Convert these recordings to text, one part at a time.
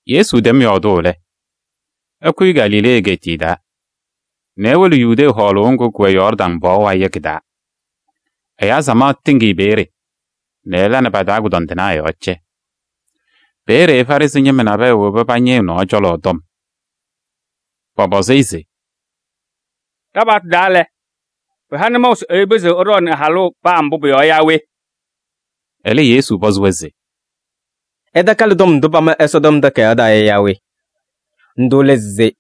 Yesu tɛm yɔɔdʋʋ lɛ, ɛkʋyɩ Galilee egeetiye taa nɛ ewolo Yudee hɔɔlʋʋ ŋgʋ kʋwɛ Yɔɔrdaŋ pɔɔ wayɩ yɔ kɩ-taa. Ɛyaa samaɣ tɩŋ-ɩ peeye nɛ ɛla nɛ pa-taa kʋdɔndɩnaa yɔɔ cɛ. Peeye Farɩsɩ ñɩma nabɛyɛ woba pañɩ ɛ-nɔɔ cɔlɔ tɔm. Pɔpɔzɩ-ɩ se: “Ɖa-paɣtʋ taa lɛ, pɩha nʋmɔʋ se ɛyʋ pɩzɩɣ ɛɖɔɔnɩ ɛ-halʋ paa mbʋ pʋ-yɔɔ yaa we?” Ɛlɛ, Yesu pɔzɩ-wɛ se: “Ɩtakalɩ tɔm ndʋ pama Ɛsɔtɔm Takayaɣ taa yɔ yaa we? Ndʋ lɛ se: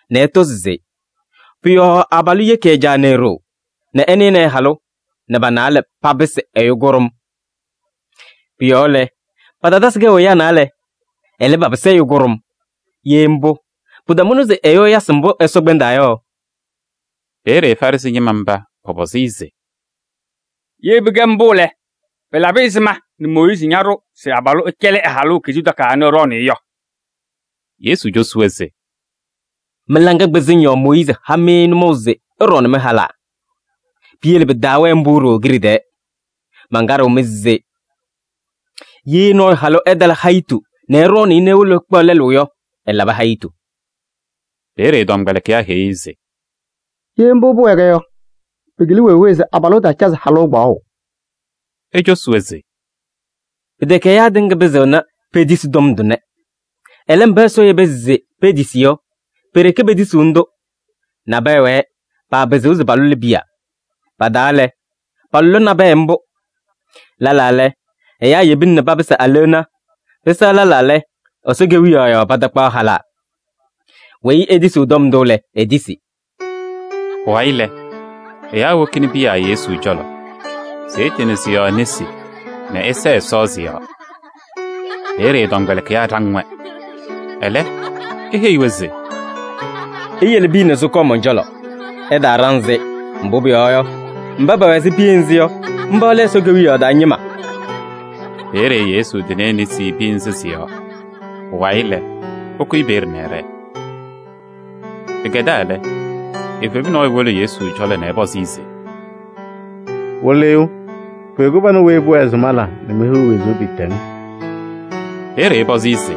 nɛ ɛtɔ se: pʋ-yɔɔ abalʋ yeki ɛ-caa nɛ e-ɖoo nɛ ɛnɩnɩ ɛ-halʋ nɛ pa-naalɛ papɩsɩ ɛyʋ kʋɖʋm.’ Pʋ-yɔɔ lɛ, patatasɩ kɛʋ ɛyaa naalɛ. Ɛlɛ, papɩsɩ ɛyʋ kʋɖʋm. Ye mbʋ, pɩtamʋna se ɛyʋ ɛyasɩ mbʋ Ɛsɔ kpɛndaa yɔ.” Peeye Farɩsɩ ñɩma mba pɔpɔzɩ-ɩ se: “Ye pɩkɛ mbʋ lɛ, pɩlabɩ ɛzɩma nɛ Mooyiizi ñaɖʋ se abalʋ ɛcɛlɩ ɛ-halʋ kizuu takayaɣ nɛ ɛɖɔɔnɩ-ɩ yɔ?” Yesu cosi-wɛ se: “Mɩ-laŋa kpɩzɩŋ yɔɔ Mooyiizi ha-mɩ nʋmɔʋ se ɩɖɔɔnɩ mɩ-halaa. Piyele pɩtaawɛɛ mbʋ ɖooo kiɖe tɛɛ. Mankaɖɩɣ-mɩ se: ye nɔɔyʋ halʋ ɛtala hayɩtʋ nɛ ɛɖɔɔnɩ-ɩ nɛ ewolo ɛkpaɣ lɛlʋ yɔ, ɛlabɩ hayitu.” Peeye ɛ-tɔmkpɛlɩkɩyaa heyi-i se: “Ye mbʋ pʋwɛɛ yɔ, pɩkɩlɩ wee wee se abalʋ ɛtaacazɩ kpaɣʋ halʋ.” Ecosi-wɛ se: “Pɩtɛkɛ ɛyaa tɩŋa pɩzɩɣna petisi tɔm tʋnɛ. Ɛlɛ, mba Ɛsɔ yeba se petisi yɔ, pe-ɖeke petisiɣni-tʋ. Nabɛyɛ wɛɛ, paapɩzɩɣ se palʋlɩ piya: pa-taa lɛ, palʋlɩ nabɛyɛ mbʋ. Lɛlaa lɛ, ɛyaa yebina nɛ papɩsɩ aleɣna, pɩsɛɣ lɛlaa lɛ, Ɛsɔ Kewiyaɣ yɔɔ patakpaɣ halaa. Weyi etisiɣ tɔm ndʋ lɛ, etisi.” Pʋwayɩ lɛ, ɛyaa wokini piya Yesu cɔlɔ se ɛtɩnɩ sɩ-yɔɔ nesi nɛ ɛsɛɛ Ɛsɔ sɩ-yɔɔ. Peeye ɛ-tɔmkpɛlɩkɩyaa ɖaŋ-wɛ. Ɛlɛ, eheyi-wɛ se: “Iyele piya nɛ sɩkɔɔ mɔn-cɔlɔ, ɩtaaɖaŋ-sɩ. Mbʋ pʋyɔɔ yɔ, mba pɛwɛ ɛzɩ piya nzɩ yɔ, mba lɛ Ɛsɔ Kewiyaɣ taa ñɩma.” Peeye Yesu tɩnɩ e-nesi piya nzɩ sɩ-yɔɔ. Pʋwayɩ lɛ, ɛkʋyɩ peeye nɛ ɛɖɛɛ. Pɩkɛdaa lɛ, evebu nɔɔyʋ wolo Yesu cɔlɔ nɛ ɛpɔzɩ-ɩ se: “Wɩlɩyʋ! Pʋyʋ kɩbanʋ weyi pʋwɛɛ se mala nɛ mehiɣ wezuu pɩɩtɛŋ?” Peeye ɛpɔzɩ-ɩ se: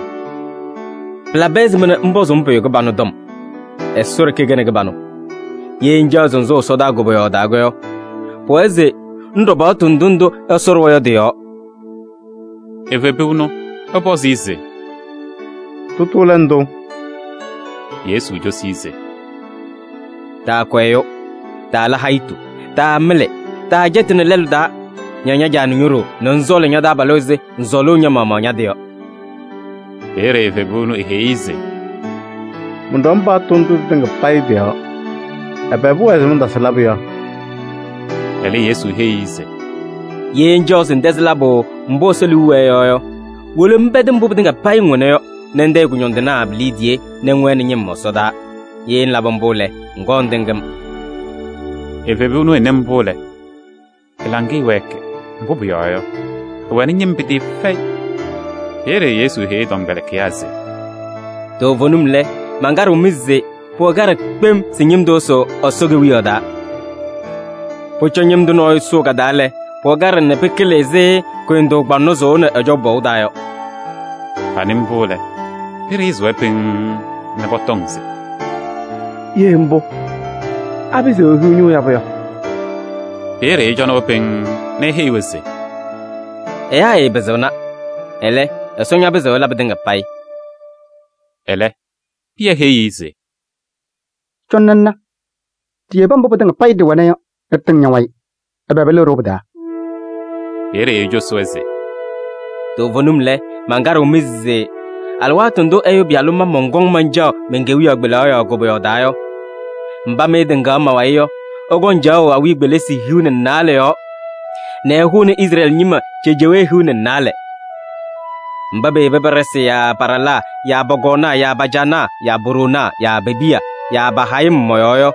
“Pɩlabɩ ɛzɩma nɛ ŋpɔzʋʋ-m pʋyʋ kɩbanʋ tɔm? Ɛsɔ ɖeke kɛnɩ kɩbanʋ. Ye ŋcaɣ se ŋsʋʋ ɛsɔdaa koboyaɣ taa yɔ, pʋwɛɛ se ŋɖɔ paɣtʋ ndʋ ndʋ Ɛsɔ ɖʋwa yɔ tɩ-yɔɔ.” Evebu ɛnʋ ɛpɔzɩ-ɩ se: “Tʋtʋ lɛ ndʋ?” Yesu cosi-i se: “Taakʋ ɛyʋ, taala hayitu, taamɩlɩ, taacɛtɩnɩ lɛlʋ taa, ña ña-caa nɛ ño-ɖoo nɛ ŋsɔɔlɩ ña-taabalʋ ɛzɩ ŋsɔɔlʋʋ ña-maɣmaɣ ña-tɩ yɔ.” Peeye evebu ɛnʋ eheyi-i se: “Mɔnɖɔm paɣtʋ ndʋ tɩtɩŋa payɩ tɩ-yɔɔ. Ɛbɛ pʋwɛɛ se mantasɩ labʋ yɔ?” Ɛlɛ, Yesu heyi-i se: “Ye ŋcaɣ se ŋtɛzɩ labʋ mbʋ Ɛsɔ liu wɛɛ yɔ yɔ, wolo ŋpɛdɩ mbʋ pɩtɩŋa payɩ ŋwɛna yɔ nɛ ŋtayɩ kʋñɔndɩnaa pi-liidiye nɛ ŋwɛnɩ ñɩm ɛsɔdaa. Ye ŋlabɩ mbʋ lɛ, ŋkɔɔ ŋtɩŋ-m.” Evebu ɛnʋ ɛnɩ mbʋ lɛ, ɛ-laŋɩyɛ wɛɛkɩ, mbʋ pʋyɔɔ yɔ, ɛwɛnɩ ñɩm pɩtɩɩfɛyɩ. Peeye Yesu heyi ɛ-tɔmkpɛlɩkɩyaa se: “Toovenim lɛ, mankaɖɩɣ-mɩ se: pʋwɛ kaɖɛ kpem se ñɩm tʋ ɛsʋʋ Ɛsɔ Kewiyaɣ taa. Pʋcɔ ñɩm tʋ nɔɔyʋ sʋʋ ka-taa lɛ, pʋwɛ kaɖɛ nɛ pɩkɩlɩ ɛzɩ kʋyʋndʋʋ kpaŋnɔ sʋʋʋnɩ ɛjɔʋ pɔʋ taa yɔ.” Panɩ mbʋ lɛ, pɩɖɩɣzɩ-wɛ pɩŋŋ nɛ pɔtɔŋ se: “Ye mbʋ, apɩzɩɣ ehiɣ ñʋʋ yabʋ yɔ?” Peeye ɛcɔnɩ-wɛ pɩŋŋ nɛ eheyi-wɛ se: “Ɛyaa ɛɛpɩzɩɣna, ɛlɛ, Ɛsɔ ñapɩzɩɣ ɛla pɩtɩŋa payɩ.” Ɛlɛ, Pɩyɛ heyi-i se: “Cɔnɩ ŋna ɖiyebi mbʋ pɩtɩŋa payɩ ɖɩwɛna yɔ nɛ ɖɩtɩŋ ña-wayɩ. Ɛbɛ pɩlɩɣ-ɖʋ pɩ-taa?” Peeye ecosi-wɛ se: “Toovenim lɛ, mankaɖɩɣ-mɩ se alɩwaatʋ ndʋ Ɛyʋ Pɩyalʋ ma mɔnkɔŋ mancaɣ men-kewiyaɣ kpelaɣ yɔɔ koboyaɣ taa yɔ, mba mɩ ɩtɩŋaɣ ma-wayɩ yɔ, ɩkɔŋ caɣʋ awiya kpelisi hiu nɛ naalɛ yɔɔ nɛ ɩhʋnɩ Izrɛɛlɩ ñɩma cejewee hiu nɛ naalɛ. Mba peyebi pa-ɖɩsɩ yaa pa-ɖalaa yaa pɔ-kɔɔnaa yaa pa-caanaa yaa po-ɖoonaa yaa pe-piya yaa pa-hayɩm mɔ-yɔɔ yɔ,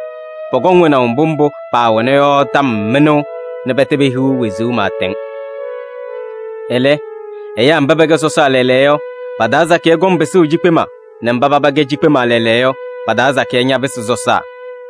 pɔkɔŋ wɛnaʋ mbʋ mbʋ paawɛna yɔ tɔm mɩnʋʋ nɛ pɛtɛ pehiɣ wezuu pɩɩtɛŋ. “Ɛlɛ, ɛyaa mba pɛkɛ sɔsaa lɛɛlɛɛyɔ yɔ, pa-taa sakɩyɛ kɔŋ pɩsʋʋ cikpema nɛ mba paba kɛ cikpema lɛɛlɛɛyɔ yɔ, pa-taa sakɩyɛ ñapɩsɩ sɔsaa.”